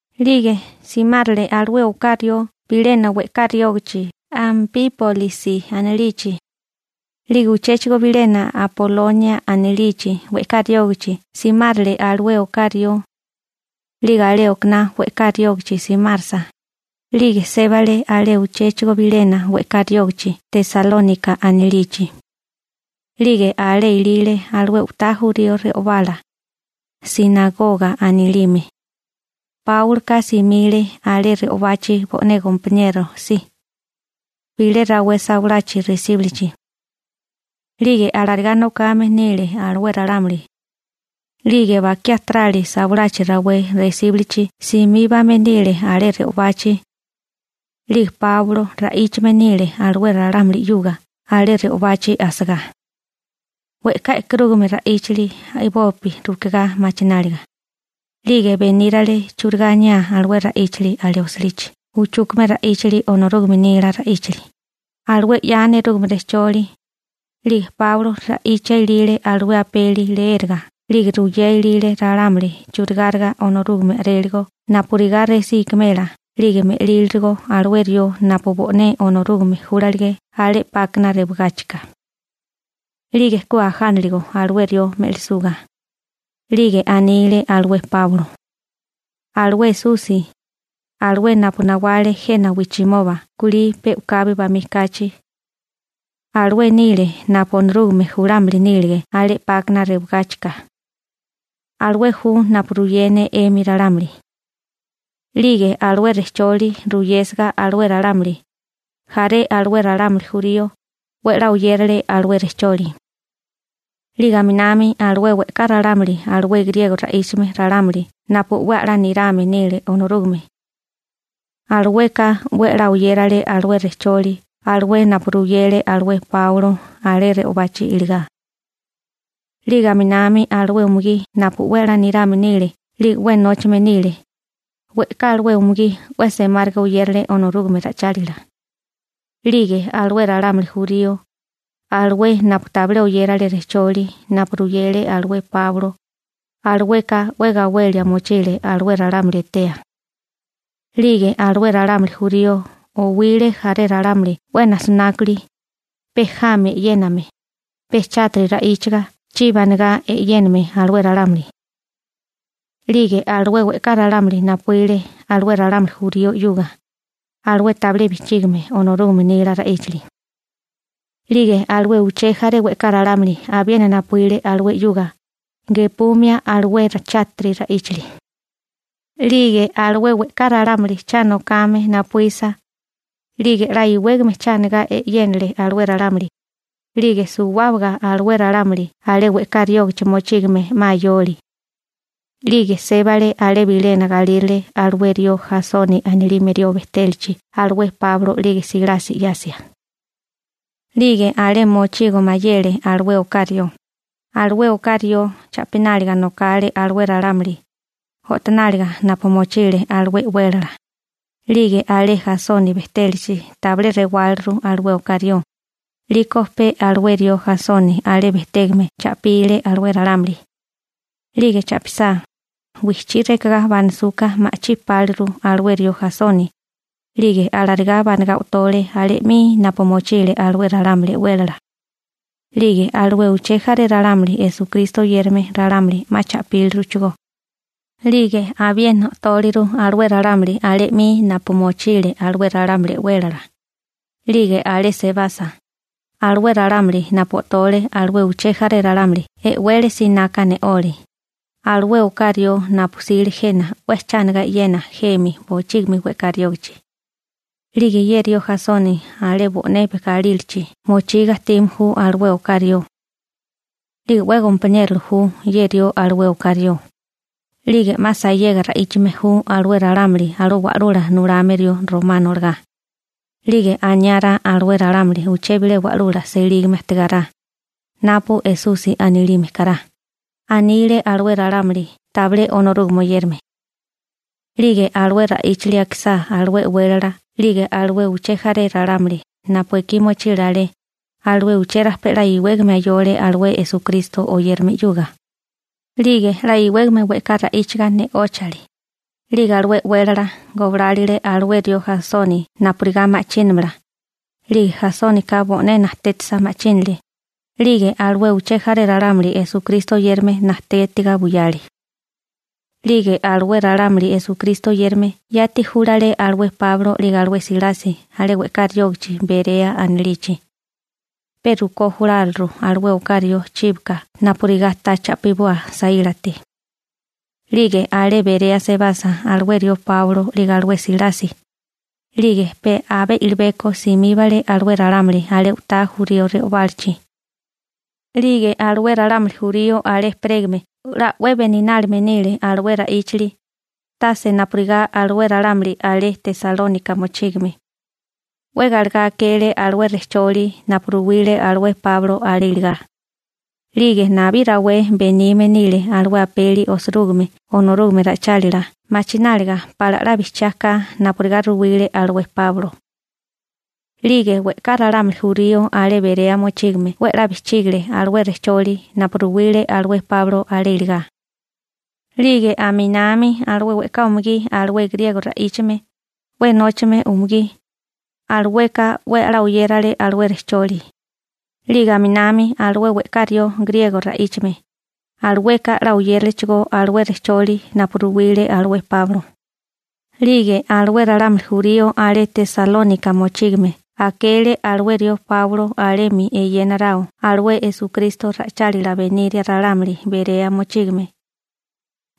'Lige simárele alué oká rió bilena we'ká riógichi Anpípolisi anilichi. 'Lige uchéchigo bilena Apolonia anilichi we'ká riógichi simárele alué oká rió. 'Lige alé okaná we'ká riógichi simárasa, 'lige sébale alé uchéchigo bilena we'ká riógichi Tesalónika anilichi. 'Lige alé ilile alué u'tá re'obá jurío re'obala, «sinagoga» anilime. Páuloka simile alé re'obachi bo'né gompaniero si, bilé rawé sawalachi resíbulichi. 'Lige alarigá nokame nile alué ralámuli. 'Lige bakiá tarali sawalachi rawé resíbulichi simíbame nile alé re'obachi. 'Lige Páulo ra'íchame nile alué ralámuli 'yuga alé re'obachi asagá. We'ká e'karúgame ra'íchali a'bopi rukigá machináliga. 'Lige benírale churigá aniá alué ra'íchili alé osilichi uchúkame ra'íchili Onorúgame nila ra'íchali, alué 'ya nerúgame rejcholi. 'Lige Páulo ra'ichia ilile alué apeli leéraga 'lige ruyea ilile ralámuli churigáriga Onorúgame a'réligo napurigá resí ikimela 'lige me'lílirigo alué rió napu bo'né Onorúgame júlalige alé 'pákana rewagáchika. 'Lige ku ajániligo alué rió me'lisuga. 'Lige anile alué Páulo: ―Alué Esusi, alué napu nawale jena wijchimoba kulí pe u'kabi bamí kachi, alué nile napu Onorúgame julámili nílige alé 'pákana rewagáchika. Alué ju napu ruyé ne 'emi ralámuli. 'Lige alué rejcholi ruyésiga alué ralámuli, jaré alué ralámuli jurío 'we a'lá oyérale alué rejcholi. 'Lige aminami alué we'ká ralámuli alué griego ra'íchame ralámuli napu 'we a'lá nirame nile Onorúgame, alueka 'we a'lá oyérale alué rejcholi alué napu ruyele alué Páulo alé re'obachi iligá. 'Lige aminami alué umugí napu 'we a'lá nirame nile 'lige 'we nóchame nile, we'ká alué umugí 'we semáriga oyérale Onorúgame ra'ichálila. 'Lige alué ralámuli jurío, alué napu tabilé oyérale rejcholi napu ruyele alué Páulo, alueka 'we gawelia mochile alué ralámuli etea. 'Lige alué ralámuli jurío owile jaré ralámuli 'we najsinákuli, pe jami e'yéname, pe chátiri ra'íchaga chibi anigá e'yéname alué ralámuli. 'Lige alué we'ká ralámuli napuíle alué ralámuli jurío 'yuga, alué tabilé bijchígime Onorúgame nila ra'íchali. 'Lige alué uché jaré we'ká ralámuli abiena napuíle alué 'yuga, gepumia alué chátiri ra'íchali. 'Lige alué we'ká ralámuli cha nokame napuísa, 'lige 'la iwégame cha anigá e'yénale alué ralámuli. 'Lige suwábaga alué ralámuli alé we'ká riógichi mochígame 'ma ayole. 'Lige sébale alé bilena galírale alué rió Jasoni anilime rió bejtélachi alué Páulo 'lige Silasi 'yasia. 'Lige alé mochigo mayele alué oká rió. Alué oká rió cha'pináliga nokale alué ralámuli o'tonáliga napu mochile alué e'wélala. 'Lige alé Jasoni bejtélachi tabilé rewáliru alué oká rió. 'Liko pe alué rió Jasoni alé bejtégame cha'pile alué ralámuli. 'Lige cha'pisá, wijchí rekagá banasuka ma'chí páliru alué rió Jasoni. 'Lige alarigá banagá o'tole alé 'mi napu mochile alué ralámuli e'wélala. 'Lige alué uché jaré ralámuli Esukristo oyérame ralámuli 'ma cha'píliruchigó. 'Lige abiena o'tóliru alué ralámuli alé 'mi napu mochile alué ralámuli e'wélala. 'Lige alé sebasa, alué ralámuli napu o'tole alué uché jaré ralámuli e'wele sinaka ne'ole: ―Alué oká rió napu jsile jena 'we cha anigá e'yena jemi bochígimi we'ká riógichi. 'Lige ye rió Jasoni alé bo'né galílachi mochiga ajtime ju alué oká rió. 'Lige 'we gompaniérola ju ye rió alué oká rió. 'Lige 'ma sayega ra'íchame ju alué ralámuli alué wa'lula nulame rió romano olagá. 'Lige aniárá alué ralámuli uché bilé wa'lula selígame ajtigárá, napu Esusi anilime kará ―anile alué ralámuli tabilé Onorúgame oyérame. 'Lige alué ra'íchili akisá alué e'wélala 'lige alué uché jaré ralámuli napu ekí mochile alé, alué uché rajpé 'la iwégame ayole alué Esukristo oyérame 'yuga. 'Lige 'la iwégame we'ká ra'íchaga ne'óchale. 'Lige alué e'wélala goblálile alué rió Jasoni napurigá ma'chínamala, 'lige Jasónika bo'né najtétisa, ma'chínale. 'Lige alué uché jaré ralámuli Esukristo oyérame najtétiga buyale. 'Lige alué ralámuli Esukristo oyérame yati júlale alué Páulo 'lige alué Silasi alé we'ká riógichi Berea anilichi. Pe rukó juláliru alué oká rió chíbaka napurigá ta cha'piboa saílate. 'Lige alé Berea sebasa alué rió Páulo 'lige alué Silasi, 'lige pe abé i'libeko simíbale alué ralámuli alé u'tá jurío re'obálachi. 'Lige alué ralámuli jurío alé ejperégame 'la 'we beninálime nile alué ra'íchili, tase napurigá alué ralámuli alé Tesalónika mochígame. 'We galegá akele alué rejcholi napu ruwile alué Páulo alé iligá. 'Lige nabí rawé benime nile alué apeli osirúgime Onorúgame ra'ichálila machináliga pala 'la bijchiá ka napurigá ruwile alué Páulo. 'Lige we'ká ralámuli jurío alé Berea mochígame 'we 'la bijchígale alué rejcholi napu ruwile alué Páulo alé iligá. 'Lige aminami alué we'ká umugí alué griego ra'íchame, 'we nóchame umugí, alueka 'we a'lá oyérale alué rejcholi. 'Lige aminami alué we'ká rió griego ra'íchame, alueka 'la oyéralechigó alué rejcholi napu ruwile alué Páulo. 'Lige alué ralámuli jurío alé Tesalónika mochígame akele alué rió Páulo alemi eyénaráo alué Esukristo ra'ichálila beníria ralámuli Berea mochígame.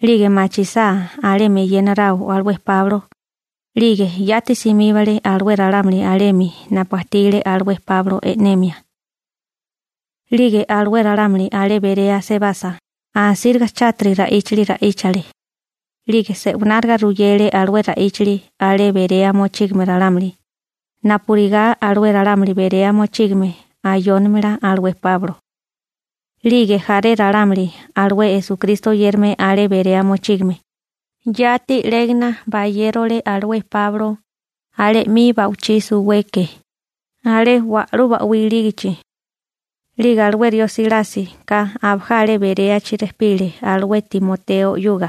'Lige machisá alemi eyénaráo alué Páulo, 'lige yati simíbale alué ralámuli alemi napu ajtile alué Páulo e'nemia. 'Lige alué ralámuli alé Berea sebasa, asíriga chátiri ra'íchili ra'íchale. 'Lige se'wináriga ruyele alué ra'íchili alé Berea mochígame ralámuli, napurigá alué ralámuli Berea mochígame ayónimala alué Páulo. 'Lige jaré ralámuli alué Esukristo oyérame alé Berea mochígame, yati 'légana bayérole alué Páulo alé 'mi ba'wichí suweke, alé wa'lú ba'wí ilígichi. 'Lige alué rió Silásika abajá alé Beréachi rejpile alué Timoteo 'yuga.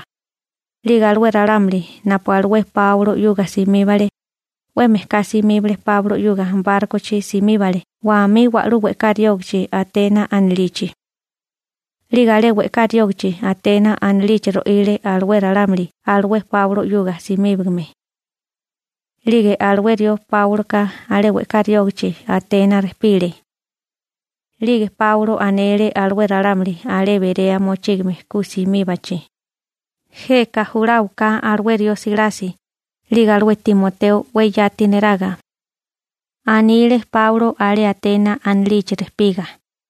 'Lige alué ralámuli napu alué Páulo 'yuga simíbale, 'we mejká simíbale Páulo 'yuga bárkochi simíbale wamí wa'lú we'ká riógichi Atena anilichi. 'Lige alé we'ká riógichi Atena anilichi ro'ile alué ralámuli alué Páulo 'yuga simíbagame. 'Lige alué rió Páuloka alé we'ká riógichi Atena rejpile. 'Lige Páulo anele alué ralámuli alé Berea mochígame ku simíbachi: ―Jeka juláwaká alué rió Silasi 'lige alué Timoteo 'we yati neraga ―anile Páulo alé Atena anilichi rejpiga.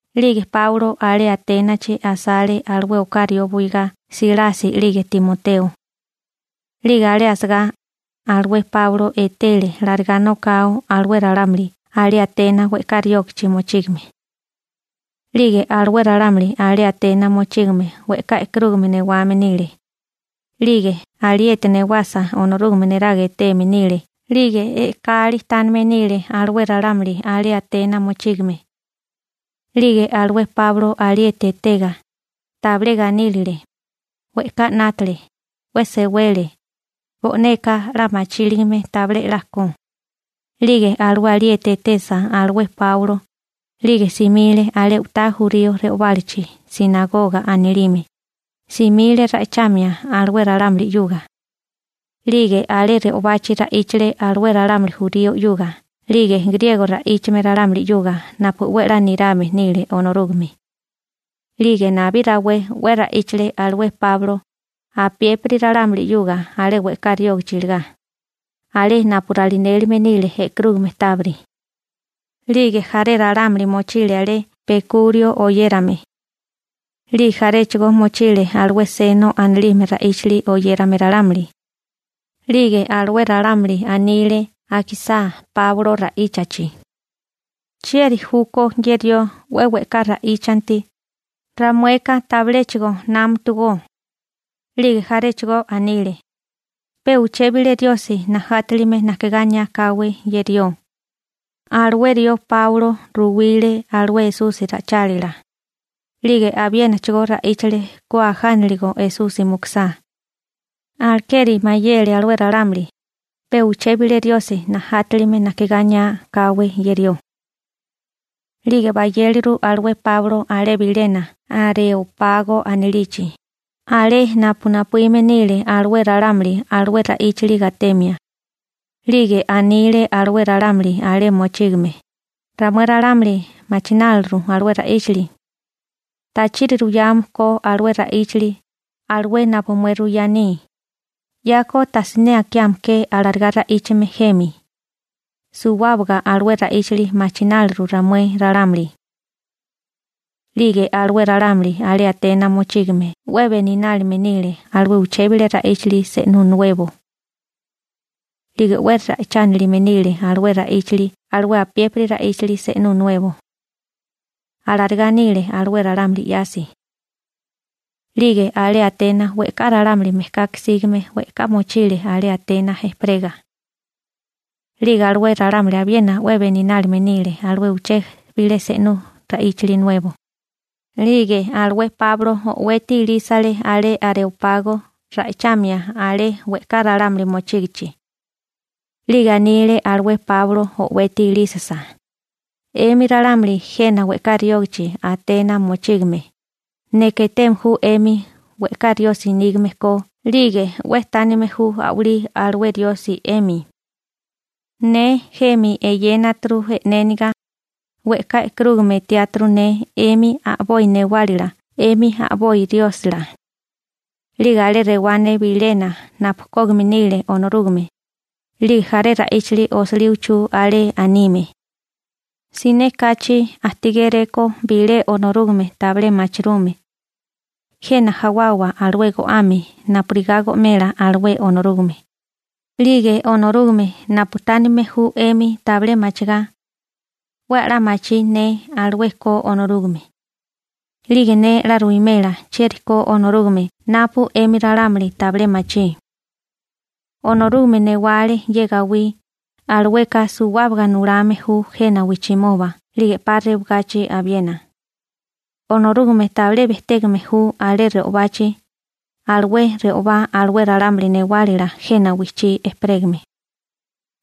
'Lige Páulo alé Aténachi asale alué oká rió buigá Silasi 'lige Timoteo. 'Lige alé asagá, alué Páulo etele larigá nokao alué ralámuli alé Atena we'ká riógichi mochígame. 'Lige alué ralámuli alé Atena mochígame we'ká e'karúgame newame nile. 'Lige alieti newasa Onorúgame neraga eteme nile 'lige e'kali tánime nile alué ralámuli alé Atena mochígame. 'Lige alué Páulo alieti etega, tabilé ganílile. We'ká 'nátale, 'we sewele. Bo'neka 'la machíligame tabilé 'la ko. 'Lige alué alieti etesa alué Páulo, 'lige simile alé u'tá jurío re'obálachi «sinagoga» anilime, simile ra'ichamia alué ralámuli 'yuga. 'Lige alé re'obachi ra'íchale alué ralámuli jurío 'yuga 'lige griego ra'íchame ralámuli 'yuga napu 'we 'la nirame nile Onorúgame. 'Lige nabí rawé 'we ra'íchale alué Páulo apiépiri ralámuli 'yuga alé we'ká riógichi iligá, alé napu ralinélime nile e'karúgame tábiri. 'Lige jaré ralámuli mochile alé Pekurio oyérame. 'Lige jaré mochile alué Seno anilime ra'íchili oyérame ralámuli. 'Lige alué ralámuli anile akisá Páulo ra'íchachi: ―¿Chieri júkó ye rió 'we we'ká ra'íchanti, ramueka tabiléchigo námatugó? 'Lige jaréchigo anile: ―Pe uché bilé riosi najátilime najkigá aniá káwé ye rió. Alué rió Páulo ruwile alué Esusi ra'ichálila, 'lige abiénachigó ra'íchale ku ajániligo Esusi mukusá. Alekeri mayele alué ralámuli: «Pe uché bilé riosi najátilime najkigá aniá káwé ye rió.» 'Lige bayéleru alué Páulo alé bilena Areópago anilichi, alé napu napuíme nile alué ralámuli alué ra'íchili gatemia. 'Lige anile alué ralámuli alé mochígame: ―Ramué ralámuli machináliru alué ra'íchali, ¿tachiri ruyame ko alué ra'íchili, alué napu mué ruyá aní? 'Yako tasiné akiame ke alarigá ra'íchame jemi. Suwábaga alué ra'íchali machináliru ramué ralámuli. 'Lige alué ralámuli alé Atena mochígame 'we beninálime nile alué uché bilé ra'íchili se'nú nuebo. 'Lige 'we ra'ichánilime nile alué ra'íchili alué apiépiri ra'íchili se'nú nuebo. Alarigá nile alué ralámuli 'yasi. 'Lige alé Atena we'ká ralámuli mejkaka sígame we'ká mochile alé Atena ejperega. 'Lige alué ralámuli abiena 'we beninálime nile alué uché bilé se'nú ra'íchili nuebo. 'Lige alué Páulo o'weti ilísale alé Areópago ra'ichamia alé we'ká ralámuli mochígichi. 'Lige anile alué Páulo o'weti ilísisa: ―'Emi ralámuli jena we'ká riógichi Atena mochígame, neka eteme ju 'emi we'ká riosi nígame ko 'lige 'we tánime ju a'walí alué riosi 'emi. Ne jemi eyénaturu e'néniga, we'ká e'karúgame etiáturu ne 'emi a'boi newálala 'emi a'boi riósila. 'Lige alé rewá ne bilena napu kógime nile Onorúgame. 'Lige jaré ra'íchili osilí uchú alé anime: «Siné kachi ajtigéréko bilé Onorúgame tabilé machirume. Jena jawawa alué go'ame napurigá go'mela alué Onorúgame.» 'Lige Onorúgame napu tánime ju 'emi tabilé machigá, 'we a'lá machí ne alué ko Onorúgame. 'Lige ne 'la ruwimela chieri ko Onorúgame napu 'emi ralámuli tabilé machí. › Onorúgame newale ye gawí, alueka suwábaga nulame ju jena wijchimoba 'lige 'pa rewagachi abiena. Onorúgame tabilé bejtégame ju alé re'obachi, alué re'obá alué ralámuli newálila jena wijchí ejperégame.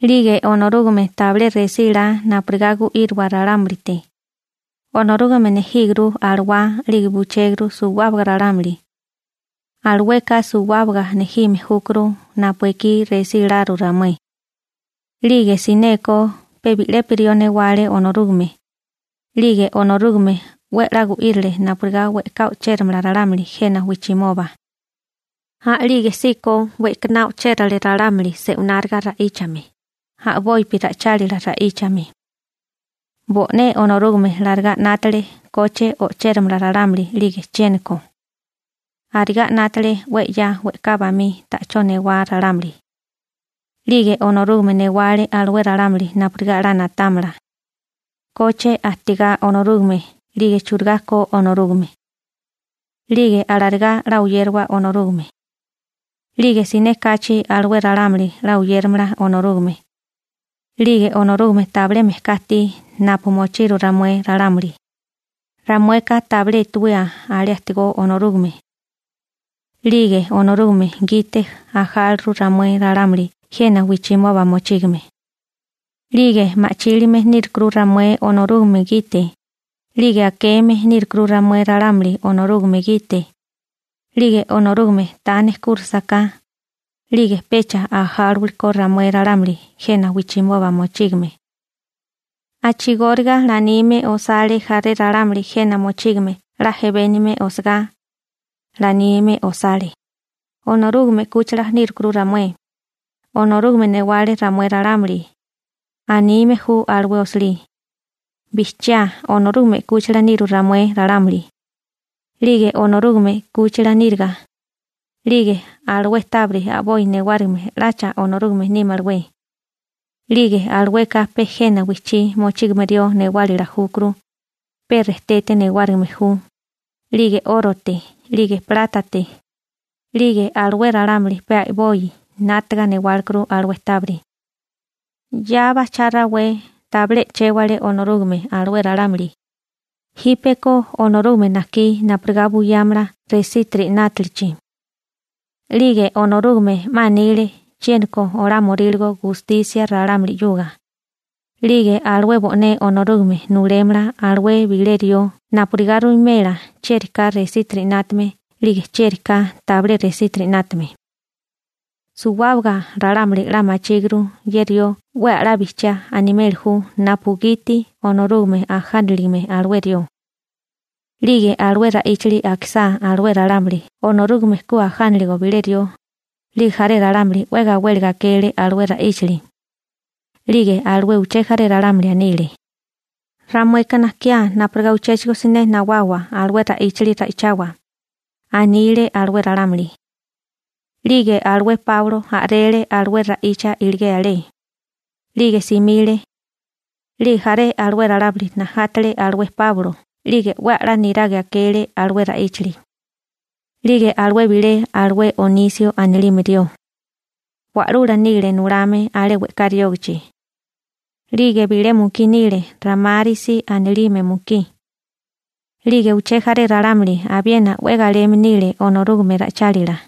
'Lige Onorúgame tabilé resílá napurigá gu'íriwa ralámulite. Onorúgame nejíguru alawá 'lige buchéguru suwábaga ralámuli. Alueka suwábaga nejime júkuru napu ekí resíláru ramué. › 'Lige sineko pe bi'lepi rió newale Onorúgame. 'Lige Onorúgame 'we a'lá gu'írile napurigá we'ká o'chéramala ralámuli jena wijchimoba. A'lígesíko we'kaná o'chérale ralámuli se'wináriga ra'íchame, a'bopi ra'ichálila ra'íchame. Bo'né Onorúgame 'la 'nátale koche o'chéramala ralámuli 'lige chiéniko. Arigá 'nátale 'we 'ya we'ká bamí ta'chó newá ralámuli. 'Lige Onorúgame newale alué ralámuli napurigá 'la na'támala, «¿Koche ajtigá Onorúgame 'lige churigá ko Onorúgame?» 'lige alarigá 'la oyérawa Onorúgame, 'lige siné kachi alué ralámuli 'la oyéramala Onorúgame. 'Lige Onorúgame tabilé mejká ajtí napu mochiru ramué ralámuli, ramueka tabilé etewía alé ajtígó Onorúgame. 'Lige Onorúgame gite ajáluru ramué ralámuli jena wijchimoba mochígame. 'Lige ma'chílime nírukuru ramué Onorúgame gite, 'lige akeme nírukuru ramué ralámuli Onorúgame gite. 'Lige Onorúgame ta nejkúrisaká, 'lige pecha ajáliwakó ramué ralámuli jena wijchimoba mochígame. A'chigóriga 'la anime osale jaré ralámuli jena mochígame 'la jebénigame osagá, 'la anime osale: «Onorúgame 'kúchila nírukuru ramué, Onorúgame newale ramué ralámuli», anime ju alué osilí. Bijchiá Onorúgame 'kúchila niru ramué ralámuli. 'Lige Onorúgame 'kúchila níriga, 'lige ¿alué tábiri a'boi newárigime 'lacha Onorúgame nímalawé? 'Lige alueka pe jena wijchí mochígame rió newálila júkuru, pe rejtete newárigime ju, 'lige 'órote 'lige plátate, 'lige alué ralámuli pe a'boi 'nátaga newálekuru alué tábiri. 'Ya bajchá rawé tabilé e'chéwale Onorúgame alué ralámuli, jípeko Onorúgame najkí napurigá buyámala resítiri 'nátalichi. 'Lige Onorúgame 'ma anile chiéniko olamio gustisia ralámuli. 'Lige alué bo'né Onorúgame nulémala alué bilé rió napurigá ruwimela chieri ka resítiri 'nátame 'lige chieri ka tabilé resítiri 'nátame. Suwábaga ralámuli 'la machíguru ye rió 'we a'lá bijchiá animeli ju napugiti Onorúgame ajániligame alué rió. 'Lige alué ra'íchili akisá alué ralámuli Onorúgame ku ajánaligo bilé rió, 'lige jaré ralámuli 'we gawéliga akele alué ra'íchili. 'Lige alué uché jaré ralámuli anile: ―Ramueka najkiá napurigá uchéchigo siné nawawa alué ra'íchali ra'ichawa ―anile alué ralámuli. 'Lige alué Páulo a'rele alué ra'icha iligé alé, 'lige simile. 'Lige jaré alué ralámuli najátele alué Páulo 'lige 'we a'lá niraga akele alué ra'íchali. 'Lige alué bilé alué Onisio anilime rió, wa'lula nile nulame alé we'ká riógichi. 'Lige bilé mukí nile Ramárisi anilime mukí. 'Lige uché jaré ralámuli abiena 'we galeme nile Onorúgame ra'ichálila.